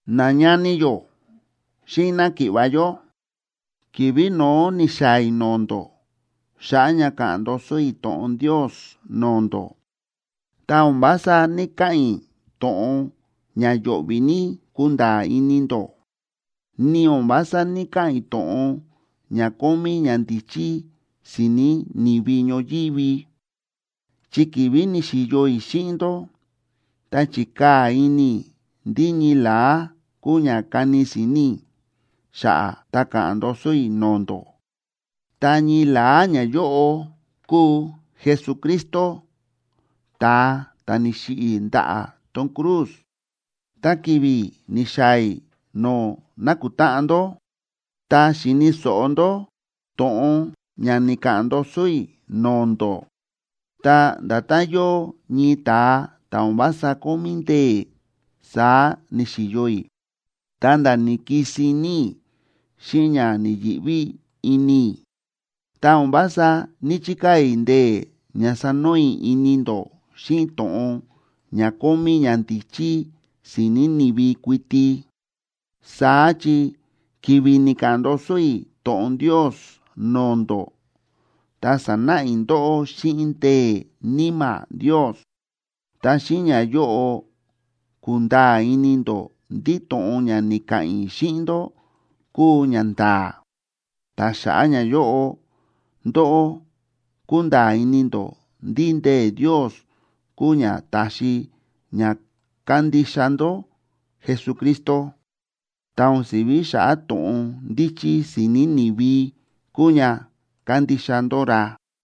Nañani yó xíꞌin náki̱ꞌva̱ yó, ki̱vi̱ no̱ó ni̱xaa̱ i̱ no̱o̱ ndó xa̱ꞌa̱ ña káꞌa̱n ndoso i̱ to̱ꞌon Ndios no̱o̱ ndó, ta o̱n vása ní‑kaꞌa̱n i̱ to̱ꞌon ña yo̱ꞌvi̱ ní kunda̱a̱ ini ndó, ni o̱n vása ní‑kaꞌa̱n i̱ to̱ꞌon ña kómí ñandíchí si̱ni̱ ni̱vi ñoyívi. Chi ki̱vi̱ ni̱xi̱yo i̱ xíꞌin ndó, ta chi̱kaa̱ ini i̱ ndí ñii la̱á kuu ña kani si̱ni̱ i̱ xa̱ꞌa̱ ta ka̱ꞌa̱n ndoso i̱ no̱o̱ ndó, ta ñii la̱á ñayóꞌo kúu Jesucristo, ta̱a ta̱ ni̱xiꞌi̱ ndaꞌa̱ tón cruz. Ta ki̱vi̱ ni̱xaa̱ i̱ no̱o̱ na̱kutáꞌan ndó ta xi̱ni̱ so̱ꞌo ndó to̱ꞌon ña ni̱ka̱ꞌa̱n ndoso i̱ no̱o̱ ndó, ta nda̱tán yóo ñii ta̱a ta̱ o̱n vása kómí ndee̱, saá ni̱xi̱yo i̱, ta̱nda̱ ni̱kisin ní i̱ xíꞌin ña ni̱yi̱ꞌví ini i̱. Ta o̱n vása ní‑chikaa̱ i̱ ndee̱ ña sanoo i̱ ini ndó xíꞌin to̱ꞌon ña kómí ñandíchí si̱ni̱ ni̱vi kuiti. Saá chi ki̱vi̱ ni̱ka̱ꞌa̱n ndoso i̱ to̱ꞌon Ndios no̱o̱ ndó, ta sa̱náꞌa i̱ ndóꞌó xíꞌin ndee̱ Níma̱ Ndios, ta xíꞌin ñayóꞌo ku̱nda̱a̱ ini ndó ndí to̱ꞌon ña ni̱ka̱ꞌa̱n i̱ xíꞌin ndó kúu ñanda̱a̱. Ta xa̱ꞌa̱ ñayóꞌo, ndóꞌó kúnda̱a̱ ini ndó ndí ndee̱ Ndios kúu ña ta̱xi ña kándixa ndó Jesucristo, ta o̱n si̱ví xa̱ꞌa̱ to̱ꞌon ndíchí si̱ni̱ ni̱vi kúu ña kándixa ndó ra.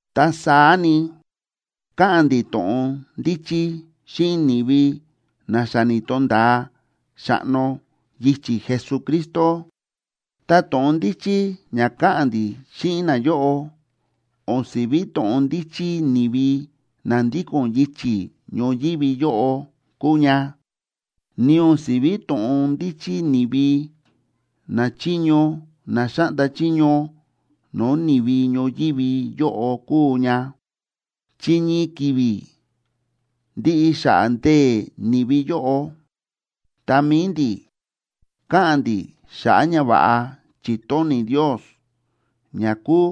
Ta saá ni, káꞌa̱n ndi̱ to̱ꞌon ndíchí xíꞌin ni̱vi na xa ni̱to̱nda̱a xa̱ꞌno yichi̱ Jesucristo. Ta to̱ꞌon ndíchí ña káꞌa̱n ndi̱ xíꞌin nayóꞌo o̱n si̱ví to̱ꞌon ndíchí ni̱vi na ndíko̱n yichi̱ ñoyívi yóꞌo kúu ña, ni o̱n si̱ví to̱ꞌon ndíchí ni̱vi nachiño na xáꞌnda chiño no̱o̱ ni̱vi ñoyívi yóꞌo kúu ña. Chi ñii ki̱vi̱, ndiꞌi xa̱ꞌa̱ ndee̱ ni̱vi yóꞌo. Ta mi̱i ndi̱, káꞌa̱n ndi̱ xa̱ꞌa̱ ñava̱ꞌa chi̱tóni̱ Ndios, ña kúu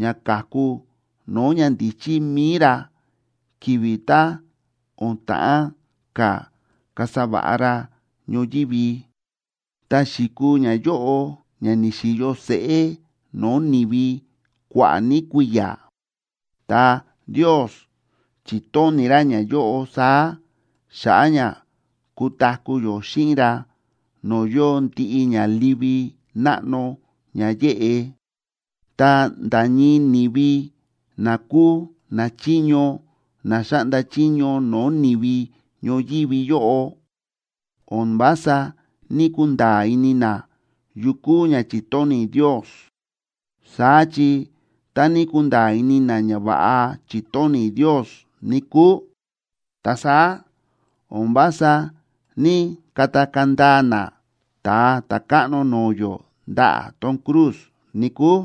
ña ka̱ku no̱o̱ ñandíchí mi̱i ra ki̱vi̱ tá o̱n ta̱ꞌán ka̱ kasa va̱ꞌa ra ñoyívi, ta xi̱kuu ñayóꞌo ña ni̱xi̱yo seꞌé no̱o̱ ni̱vi kua̱ꞌa̱ ní kui̱ya̱. Ta Ndios chi̱tóni̱ ra ñayóꞌo saá xa̱ꞌa̱ ña kutaku̱ yó xíꞌin ra no̱o̱ yóo ndiꞌi ña livi náꞌno ña yéꞌe. Ta nda̱ ñii ni̱vi na kúu nachiño na xáꞌnda chiño no̱o̱ ni̱vi ñoyívi yóꞌo, o̱n vása ní‑kunda̱a̱ ini na yu kúu ña chi̱tóni̱ Ndios. Saá chi tá ní kunda̱a̱ ini na ñava̱ꞌa chi̱tóni̱ Ndios, níkúu, ta saá o̱n vása ní‑katakaa̱ ndaa na Ta̱a Ta̱káꞌno no̱o̱ yó ndaꞌa̱ tón cruz, níkúu.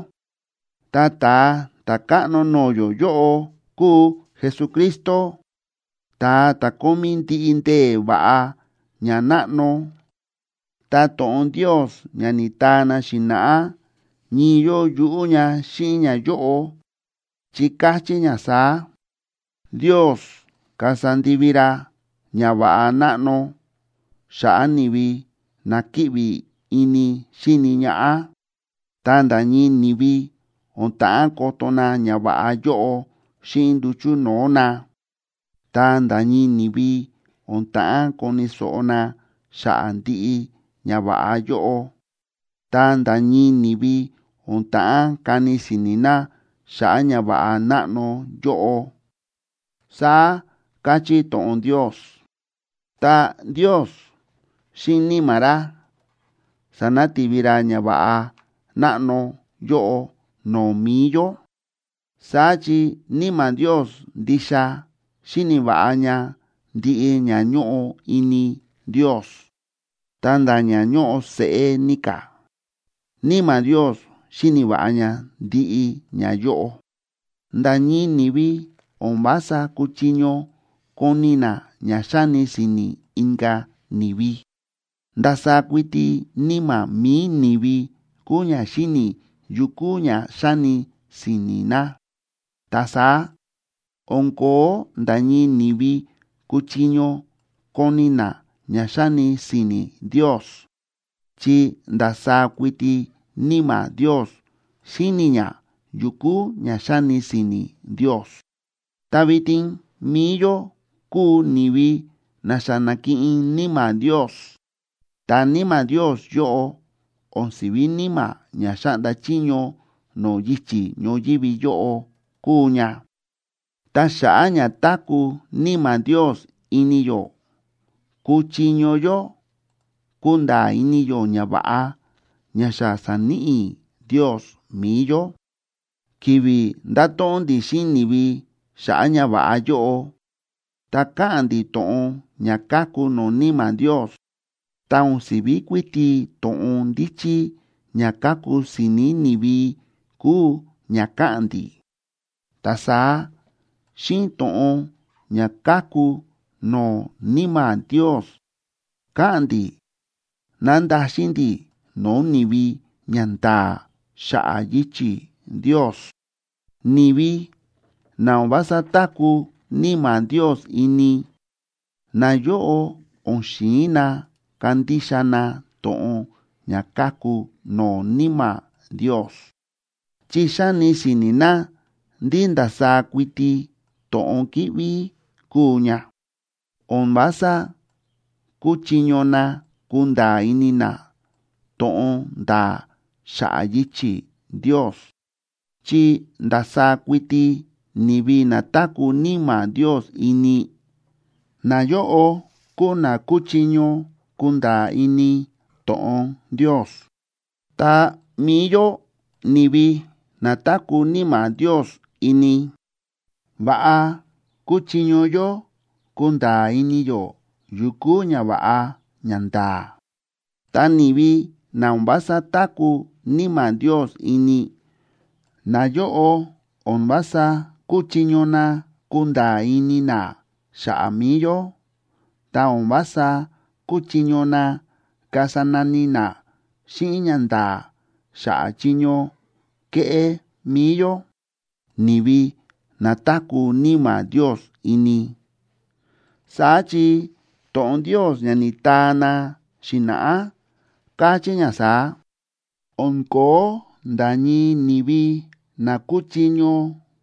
Ta Ta̱a Ta̱káꞌno no̱o̱ yó yóꞌo kúu Jesucristo, ta̱a ta̱ kómí ndiꞌi ndee̱ va̱ꞌa ña náꞌno. Ta to̱ꞌon Ndios ña ni̱taa na xi̱na̱ꞌá ñii yóo yuꞌú ña xíꞌin ñayóꞌo, chi káchí ña saá: Ndios kasa ndivi ra ñava̱ꞌa náꞌno xa̱ꞌa̱ ni̱vi na kíꞌvi ini xíni ñaꞌá. Ta nda̱ ñii ni̱vi o̱n ta̱ꞌán koto na ñava̱ꞌa yóꞌo xíꞌin nduchu̱ no̱o̱ na, ta nda̱ ñii ni̱vi o̱n ta̱ꞌán koni̱ so̱ꞌo na xa̱ꞌa̱ ndiꞌi ñava̱ꞌa yóꞌo. Ta nda̱ ñii ni̱vi o̱n ta̱ꞌán kani si̱ni̱ na xa̱ꞌa̱ ñava̱ꞌa náꞌno yóꞌo, saá káchí to̱ꞌon Ndios. Ta Ndios, xíꞌin Níma̱ ra sa̱nati̱vi ra ñava̱ꞌa náꞌno yóꞌo no̱o̱ mi̱i yó. Saá chi Níma̱ Ndios ndixa xíni̱ va̱ꞌa ña ndiꞌi ña ñóꞌo ini Ndios, ta nda̱ ña ñóꞌo seꞌé ní ka̱, Níma̱ Ndios xíni̱ va̱ꞌa ña ndiꞌi ñayóꞌo. Nda̱ ñii ni̱vi o̱n vása kúchiño koni̱ na ña xáni si̱ni̱ inka̱ ni̱vi. Ndasaá kuiti níma̱ mi̱i ni̱vi kúu ña xíni̱ yu kúu ña xáni si̱ni̱ na. Ta saá o̱n ko̱ó nda̱ ñii ni̱vi kúchiño koni̱ na ña xáni si̱ni̱ Ndios, chi ndasaá kuiti Níma̱ Ndios xíni̱ ña yu kúu ña xáni si̱ni̱ Ndios. Ta vitin mi̱i yó kúu ni̱vi na xa na̱kiꞌin Níma̱ Ndios, ta Níma̱ Ndios yóꞌo o̱n si̱ví níma̱ ña xáꞌnda chiño no̱o̱ yichi̱ ñoyívi yóꞌo kúu ña. Ta xa̱ꞌa̱ ña táku̱ Níma̱ Ndios ini yó, kúchiño yó kunda̱a̱ ini yó ñava̱ꞌa ña xa sa̱níꞌi Ndios mi̱i yó. Ki̱vi̱ ndáto̱ꞌon ndi̱ xíꞌin ni̱vi xa̱ꞌa̱ ñava̱ꞌa yóꞌo, ta káꞌa̱n ndi̱ to̱ꞌon ña káku no̱o̱ Níma̱ Ndios, ta o̱n si̱ví kuiti to̱ꞌon ndíchí ña káku si̱ni̱ ni̱vi kúu ña káꞌa̱n ndi̱. Ta saá xíꞌin to̱ꞌon ña káku no̱o̱ Níma̱ Ndios káꞌa̱n ndi̱ nándaxin ndi̱ no̱o̱ ni̱vi ñanda̱a̱ xa̱ꞌa̱ yichi̱ Ndios. Ni̱vi na o̱n vása táku̱ Níma̱ Ndios ini, nayóꞌo o̱n xi̱in na kandixa na to̱ꞌon ña káku no̱o̱ Níma̱ Ndios, chi xáni si̱ni̱ na ndí ndasaá kuiti to̱ꞌon kíꞌví kúu ña. O̱n vása kúchiño na kunda̱a̱ ini na to̱ꞌon nda̱a̱ xa̱ꞌa̱ yichi̱ Ndios, chi ndasaá kuiti ni̱vi na táku̱ Níma̱ Ndios ini, nayóꞌo kúu na kúchiño kunda̱a̱ ini to̱ꞌon Ndios. Ta mi̱i yó ni̱vi na táku̱ Níma̱ Ndios ini, va̱ꞌa kúchiño yó kunda̱a̱ ini yó yu kúu ñava̱ꞌa ñanda̱a̱. Ta ni̱vi na o̱n vása táku̱ Níma̱ Ndios ini, nayóꞌo o̱n vása kúchiño na kunda̱a̱ ini na xa̱ꞌa̱ mi̱i yó, ta o̱n vása kúchiño na kasa nani na xíꞌin ñanda̱a̱ xa̱ꞌa̱ chiño kéꞌé mi̱i yó, ni̱vi na táku̱ Níma̱ Ndios ini. Saá chi to̱ꞌon Ndios ña ni̱taa na xi̱na̱ꞌá káchí ña saá: “O̱n ko̱ó nda̱ ñii ni̱vi na kúchiño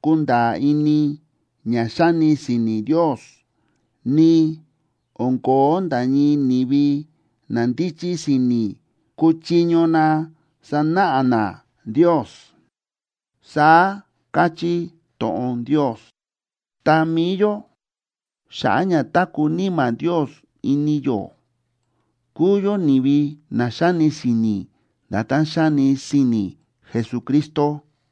kunda̱a̱ ini ña xáni si̱ni̱ Ndios. Ni o̱n ko̱ó nda̱ ñii ni̱vi na ndíchí si̱ni̱ kúchiño na sanáꞌa na Ndios”, saá káchí to̱ꞌon Ndios. Ta mi̱i yó, xa̱ꞌa̱ ña táku̱ Níma̱ Ndios ini yó, kúu yó ni̱vi na xáni si̱ni̱ nda̱tán xáni si̱ni̱ Jesucristo.